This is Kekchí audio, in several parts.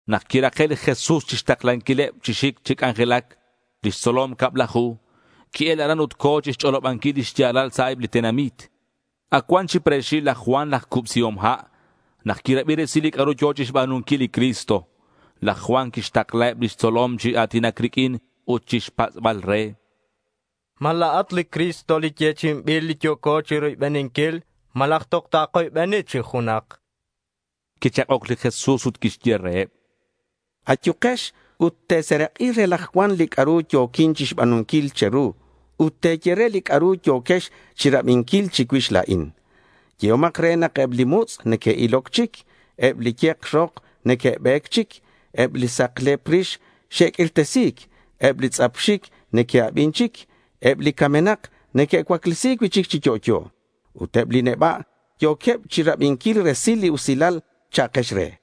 Nak quirake' li Jesús chixtaklanquileb chi xic chi c'anjelac lix tzolom cablaju, qui-el aran ut co̱ chixch'olobanquil li xya̱lal sa' eb li tenamit. Ac cuan chi pre̱xil laj Juan laj Cubsihom Ha' nak quirabi resil li c'a'ru yo̱ chixba̱nunquil li Cristo. Laj Juan quixtaklaheb lix tzolom chi a̱tinac riq'uin ut chixpatz'bal re: ¿Ma la̱at li Cristo li yechi'inbil, li yo̱co chiroybeninquil? ¿Malaj toj takoybeni chic junak? chanqueb. Quichak'oc li Jesús ut quixye reheb: —Ayukex ut te̱serak'i re laj Juan li c'a'ru yo̱quin chixba̱nunquil che̱ru ut te̱ye re li c'a'ru yo̱quex chirabinquil chicuix la̱in. Yehomak re nak eb li mutz' neque'iloc chic; eb li ye̱k rok neque'be̱c chic; eb li saklep rix xe'q'uirtesi̱c; eb li tz'ap xic neque'abin chic; eb li camenak neque'cuaclesi̱c cui'chic chi yo'yo; ut eb li neba' yo̱queb chirabinquil resil li usilal, cha'kex re.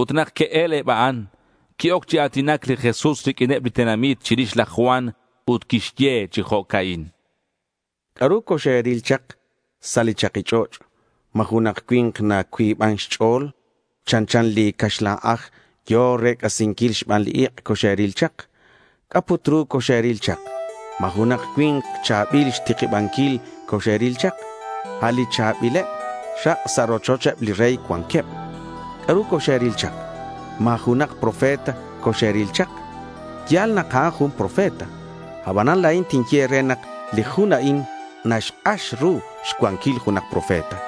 Ut nak que'el eb a'an, qui-oc chi a̱tinac li Jesús riq'uineb li tenamit chirix laj Juan ut quixye chi jo'ca'in: —¿C'a'ru coxe̱ril chak sa' li chaki ch'och'? ¿Ma junak cui̱nk nacuiban xch'o̱l chanchan li caxlan aj yo̱ rec'asinquil xban ik' coxe̱ril chak? ¿C'a' put ru coxe̱ril chak? ¿Ma junak cui̱nk cha̱bil xtikibanquil coxe̱ril chak? A' li cha̱bileb rak' sa' rochocheb li rey cuanqueb. ¿C'a'ru coxe̱ril chak? ¿Ma junak profeta coxe̱ril chak? Ya̱l nak a'an jun profeta. Abanan la̱in tinye e̱re nak li jun a'in naxk'ax ru xcuanquil junak profeta.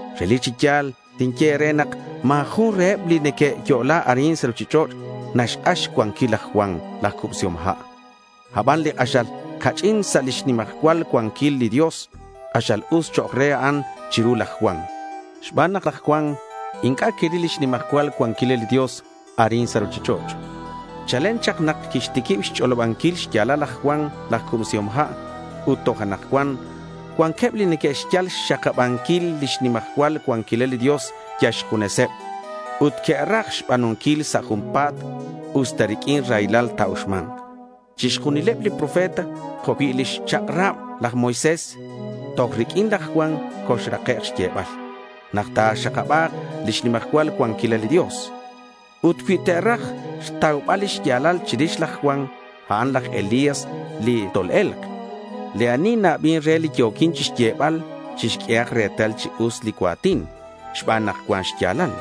Relic chi ya̱l tinye e̱re nak ma̱ jun reheb li neque'yo'la arin sa' ruchich'och' naxk'ax xcuanquil laj Juan laj Cubsihom Ha'. Aban li k'axal ca'ch'in sa' lix nimajcual cuanquil li Dios, k'axal us chok' re a'an chiru laj Juan (xban nak laj Juan inc'a' quiril lix nimajcual cuanquilal li Dios arin sa' ruchich'och'). Chalen chak nak quixtiquib xch'olobanquil xya̱lal laj Juan laj Cubsihom Ha' ut toj anakcuan cuanqueb li neque'xyal xxakabanquil lix nimajcual cuanquilal li Dios, yal xjuneseb, ut que'raj xba̱nunquil sa' junpa̱t usta riq'uin raylal ta̱uxma̱nk. Chixjunileb li profeta jo' cui' lix chak'rab laj Moisés, toj riq'uin laj Juan xolrakek' xyebal nak ta̱xakaba̱k lix nimajcual cuanquilal li Dios. Ut cui te̱raj xtaubal lix ya̱lal chirix laj Juan, a'an laj Elías li tol-e̱lk. Li ani na-abin re li yo̱quin xyebal chixq'uehak retal chi us li cua̱tin xban nak cuan xya̱lal.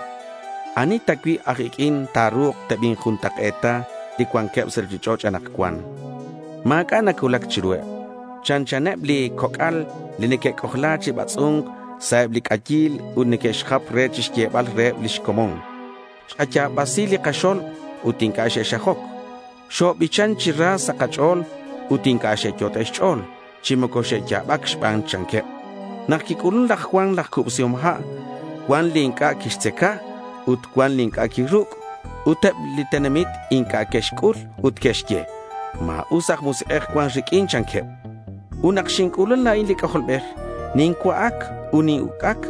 ¿Ani ta cui' aj iq'uin ta̱ru̱k tebinjuntak'e̱ta li cuanqueb sa' ruchich'och' anakcuan? Ma̱c'a' nacuulac chiruheb. Chanchaneb li coc'al li neque'c'ojla chi batz'u̱nc sa' eb li c'ayil ut neque'xjap re chixyebal reheb lix comon: “Xkaya̱basi li kaxo̱lb ut inc'a' xexxajoc; xobichan chi ra sa' kach'o̱l, ut inc'a' xyot'e' e̱ch'o̱l chi moco xexya̱bac xban”, chanqueb. Nak quic'ulun laj Juan laj Cubsihom Ha', cuan li inc'a' quixtzaca, ut cuan li inc'a' quiruc', ut eb li tenamit inc'a' que'xc'ul ut que'xye, “Ma̱us aj musik'ej cuan riq'uin”, chanqueb. Ut nak xinc'ulun la̱in li C'ajolbej, nincua'ac ut nin-uc'ac,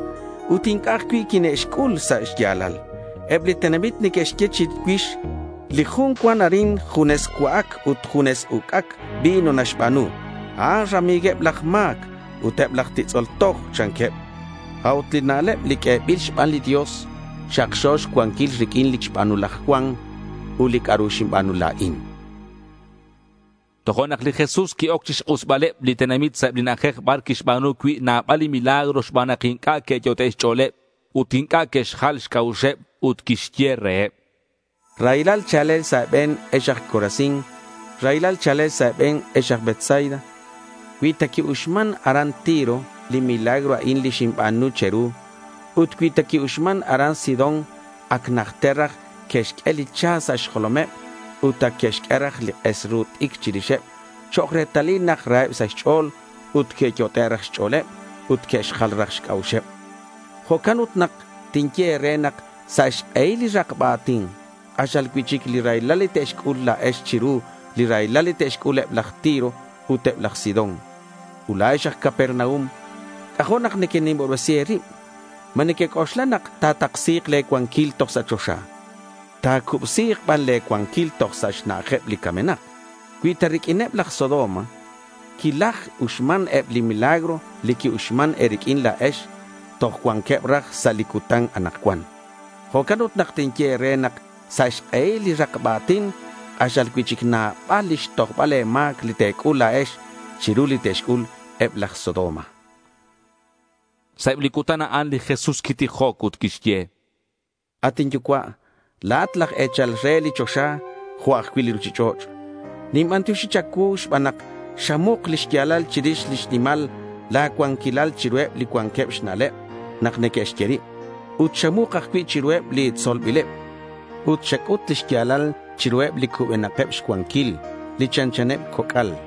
ut inc'a' ajcui' quine'xc'ul sa' xya̱lal. Eb li tenamit neque'xye chicuix, “Li jun cuan arin, junes cua'ac ut junes uc'ac vino naxba̱nu. A'an rami̱gueb laj ma̱c ut eb laj titz'ol toj”, chanqueb. A'ut li na'leb li q'uebil xban li Dios, xakxo xcuanquil riq'uin li xba̱nu laj Juan ut li c'a'ru xinba̱nu la̱in. Tojo'nak li Jesús qui-oc chixk'usbaleb li tenamit sa' eb li na'ajej bar quixba̱nu cui' nabal li milagro xban nak inc'a' que'yot'e' xch'o̱leb ut inc'a' que'xjal xc'a'uxeb, ut quixye reheb: —Raylal cha̱lel sa' e̱be̱n, ex aj Corazín. Raylal cha̱lel sa' e̱be̱n ex aj Betsaida. Cui ta qui-uxman aran Tiro li milagro a'in li xinba̱nu che̱ru ut cui ta qui-uxman aran Sidón, ac najter raj que'xq'ue li cha sa' xjolomeb ut ac que'xq'ue raj li k'es ru t'icr chirixeb chok' retalil nak raheb sa' xch'o̱l ut que'yot'e' raj xch'o̱leb ut que'xjal raj xc'a'uxeb. Jo'can ut nak tinye e̱re nak sa' xk'ehil li rakba a̱tin, k'axal cui'chic li raylal li te̱c'ul la̱ex chiru li raylal li te'xc'ul eb laj Tiro ut eb laj Sidón. Ut la̱ex aj Capernaum, c'ajo' nak nequenimobresi e̱rib. ¿Ma nequec'oxla nak ta̱taksi̱k le̱ cuanquil toj sa' choxa? Ta̱cubsi̱k ban le̱ cuanquil toj sa' xna'ajeb li camenak. Cui ta riq'uineb laj Sodoma quilaj-uxman eb li milagro li x-uxman e̱riq'uin la̱ex, toj cuanqueb raj sa' li cutan anakcuan. Jo'can ut nak tinye e̱re nak sa' xk'ehil li rakba a̱tin, k'axal cui'chic nabal lix tojbal e̱ma̱c li te̱c'ul la̱ex chiru li te'xc'ul eb laj Sodoma.— Sa' eb li cutan a'an, li Jesús quitijoc ut quixye: —At inYucua', la̱at laj e̱chal re li choxa jo' ajcui' li ruchich'och'. Ninbantioxi cha̱cuu xban nak xamuk li xya̱lal chirix lix nimal la̱ cuanquilal chiruheb li cuanqueb xna'leb nak neque'xye rib, ut xamuk ajcui' chiruheb li tzolbileb. Ut xac'ut li xya̱lal chiruheb li cubenakeb xcuanquil, li chanchaneb coc'al.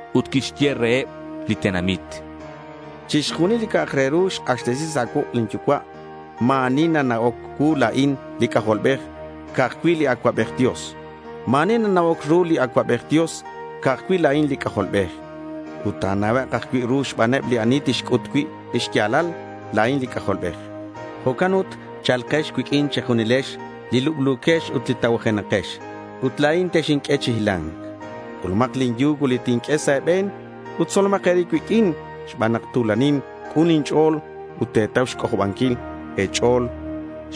Ut quixye reheb li tenamit: —Chixjunil li c'a'ak re ru xk'axtesi sa' cuuk' lin Yucua'. Ma̱ ani nana'oc cuu la̱in li C'ajolbej, ca'aj cui' li Acuabej Dios. Ma̱ ani nana'oc ru li Acuabej Dios, ca'aj cui' la̱in li C'ajolbej. Ut ta̱na'ek' ajcui' ru xbaneb li ani tinc'ut cui' li xya̱lal, la̱in li C'ajolbej. Jo'can ut cha̱lkex cuiq'uin che̱junilex li lublu̱quex ut li tacuajenakex ut la̱in texinq'ue chi hila̱nc. C'ulumak li yugo li tinq'ue sa' e̱be̱n ut tzolomak e̱rib cuiq'uin xban nak tu̱lanin ut k'un inch'o̱l ut te̱tau xc'ojobanquil e̱ch'o̱l,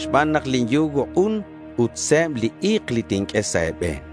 xban nak lin yugo k'un ut se̱b li i̱k li tinq'ue sa' e̱be̱n.